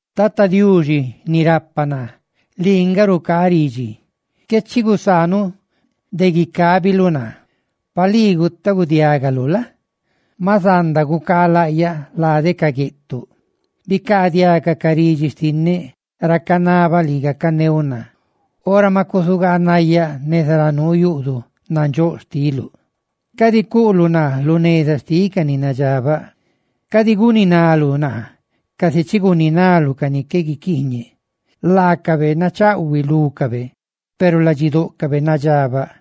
Tata Diuxi, ni rapa naa, lii nga rucaa ridxi. ¡Qué chi gusaanuꞌ de guicabiluꞌ naa! Pa lii gutaagudiagaluꞌ la? maꞌ zanda gucaa laꞌyaꞌ lade ca gueꞌtuꞌ. Bicaadiaga ca ridxi xtinneꞌ ra canabaꞌ lii gacaneuꞌ naa, ora ma cusugaanayáꞌ neza ra nuu yuꞌduꞌ nandxóꞌ xtiluꞌ. Cadi cuꞌluꞌ naa lu neza xtiꞌ ca ni nadxabaꞌ, cadi guninaluꞌ naa casi chi guninaluꞌ ca ni qué guiquiiñeꞌ, laacabe nachaꞌhuiꞌ lúcabe peru ladxidóꞌcabe nadxabaꞌ.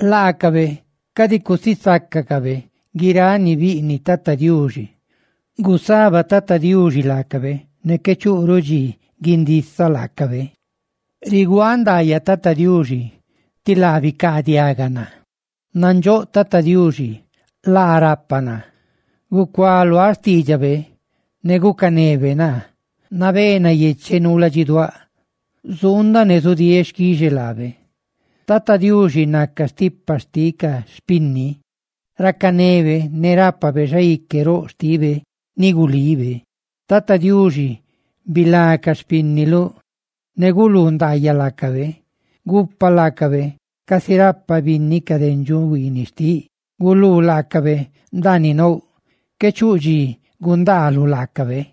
Laacabe cadi cusisácacabe guiráꞌ ni biꞌniꞌ Tata Diuxi, ¡gusaba Tata Diuxi laacabe, ne qué chuꞌruꞌ dxi guindisaꞌ laacabe! ¡Riguaaꞌ ndaayaꞌ Tata Diuxi, tí laa bicaadiaga naa! Nandxóꞌ Tata Diuxi laa rapa naa; gucualuáꞌ xtiidxabe, ne gucanebe naa. Nabé nayecheꞌ nuu ladxiduáꞌ; zuundaꞌ ne zudieeꞌ xquixe peꞌ laabe. Tata Diuxi naca stipa xtiꞌ ca xpinni; racanebe ne rápabe xaique roꞌ xtibe ni gulibe. Tata Diuxi, bilá ca xpínniluꞌ; ne guluu ndaayaꞌ laacabe. Gupa laacabe casi rapa binni ca dendxuꞌ huiiniꞌ xtiꞌ; ¡Guluu laacabe ndaaniꞌ nouꞌ qué chuꞌ dxi gundaaluꞌ laacabe!